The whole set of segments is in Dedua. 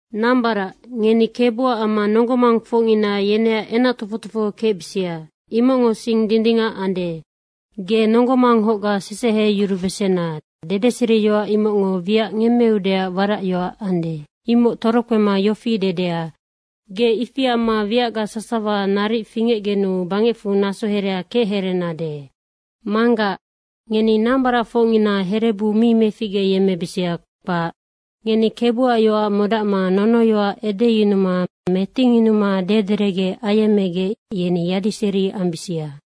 Nambarac, ngeni Kebuac amma nonggo mangfocngina yeneac enac tofoc tofoho kecbisia. Imocngo sing dindingac ande. “Ge nonggo manghocga seseheyurubesena.” Dedeseriyoac imocngo wiac ngemmeudeac waracyoac ande, imoc torokpema yofi dedea, “Ge ifi amma wiac sasawa naric fingecgenu bangecfu naso herea kechereenade.” Manggac, ngeni nambaracfocngina herebu mi meficgeyemmebisia, kpac. Ngeni Kebuac yoac modacma nonoyoac edeyunuma metingyunuma dederecge ayemmegec, yeni yadiseri ambisia.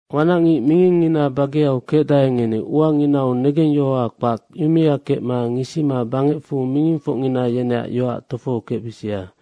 Wanacngic mingingina bageau kecdae, ngeni uanginau negengyohoa kpac, yumea kecma ngisima bangecfu mingingfocngina yeneac yoac tofohokecbisia.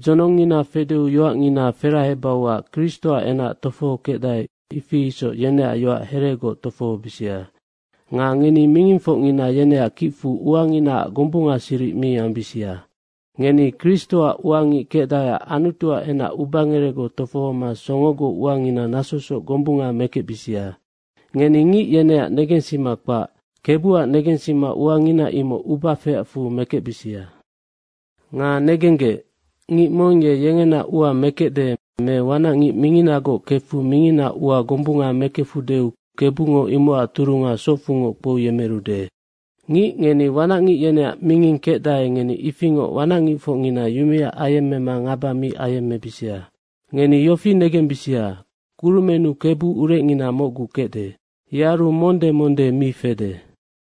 Dzonongngina fedeu yoacngina ferahebauac Kristoac enac tofohokecdae, ifi isoc yeneac yoac heregoc tofohobisia. Nga ngeni mingingfocngina yeneac kicfu uanginaac gombungasiric mi ambisia. Ngeni Kristoac ua ngic kecdaeac Anutuac enac ubangerecgoc tofohoma songogoc uangina nasosoc gombunga mekecbisia. Ngeni ngic yeneac negensima kpac, Kebuac negensima uangina imoc uba feacfu mekecbisia. Nga negenggec, ngic mong ye yengena ua mekecde me wanacngic minginagoc kefu minginaac ua gombunga mekefudeu Kebungo imocac turunga socfungoc kpouyemerude. Ngic ngeni wanac ngic yeneac minging kecdae, ngeni ifingoc wanac ngicfocngina yumea ayemmema ngaba mi ayemmebisia. Ngeni yofi negembisia, kurumennu Kebu urecngina mocgu kecde. Yearu monde monde mi fede.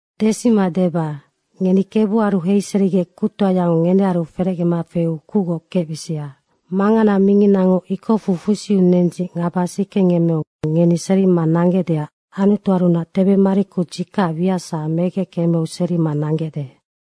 Desima deba, ngeni Kebuaru heiserigec kuctoayango ngenearu ferecgema feu kucgoc kecbisia. Mangana minginango ikocfu fusiu nendzic ngaba sikengemmeu ngeni serima nanggecdeac Anutuarunac tebemariku dzikacac wiac sasawa, imoc megec kemeu serima nanggecde.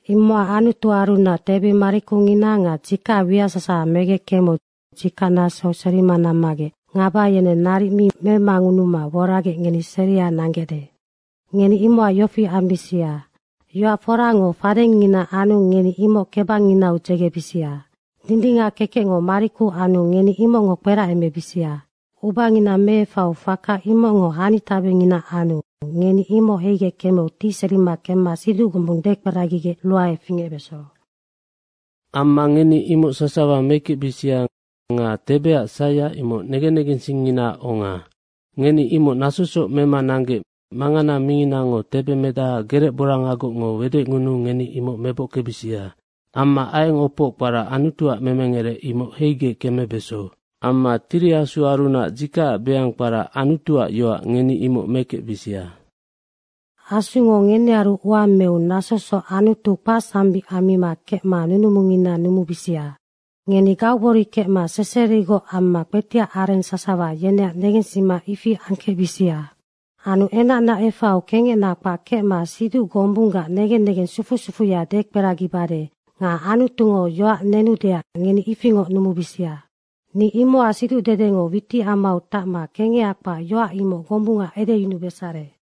Imocac Anutuarunac tebemarikungina nga dzikacac wiac sasawa, megec kemeu dzikacnasou seria nammagec ngaba yeneng naric mi memangunuma woragec ngeni seria nanggecde. Ngeni imocac yofi ambisia, yoac forango fadengngina anu ngeni imoc kebangnginau dzegebisia. Dindingac kekecngo mariku anu ngeni imocngo kperacemebisia. Ubangina meefaiu faka imocngo hanitabengina anu ngeni imoc heigec kemeu tiserima kemma siduc gombung dekperagigec ruae fingecbeso. Amma ngeni imoc sasawa mekecbisia nga tebeac saia, imoc negen negensingnginaac onga. Ngeni imoc nasosoc mema nanggec mangana minginango tebemedaha gerecborangagocngo wedecngunuu ngeni imoc mebockebisia. Amma aieng opoc kpara “Anutuac memengerec.” imoc heigec kemebeso. Amma Tiri Asuarunac dzikacac beang kpara “Anutuac yoac.” ngeni imoc mekecbisia. Asungo ngenearu ua meu nasosoc Anutu kpacsambic ammima kecma nunumungina numumibisia. Ngeni gaugbori kecma seserigoc amma kpetiac areng sasawa yeneac negensima ifi angkecbisia. Anu enacna efaiu kengecna kpac kecma siduc gombunggac negen negeng sufu sufuya dekperagiyemmebade nga Anutungo yoac nenudeac ngeni ifingoc numubisia. Ni imocac siducdedengo witicamau tacma kengeha kpac yoac imoc gombunga edeyunubesare.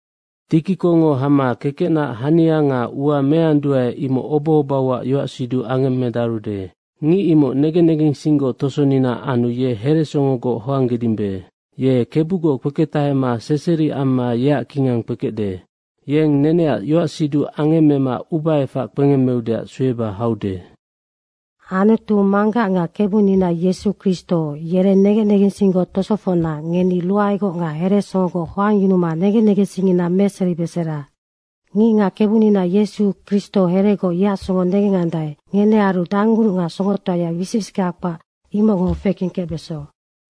Tikikongo hama kekecnaac hania nga ua meanduae, imoc obohobauac yoacsiduc angemmedarude. Ngic imoc negen negensinggoc tosonina anu ye heresongogoc hoanggedimbe. Ye Kebugoc kpeketahema seseri amma yeac kingang kpekecde. Yeng neneac yoacsiduc angemmema ubaefac kpengemmeudeac sueba haude. Anutu Manggac nga Kebunina Yesu Kristo yereng negen negensinggoc tosofocna ngeni ruaegoc nga heresongogoc hoangngunuma negen negensingngina meseribesera. Ngicngac Kebunina Yesu Kristo heregoc yeac songo negendae, ngenearu danggunuc nga songotoaya wisic wisickea kpac imocngo fekengkecbeso.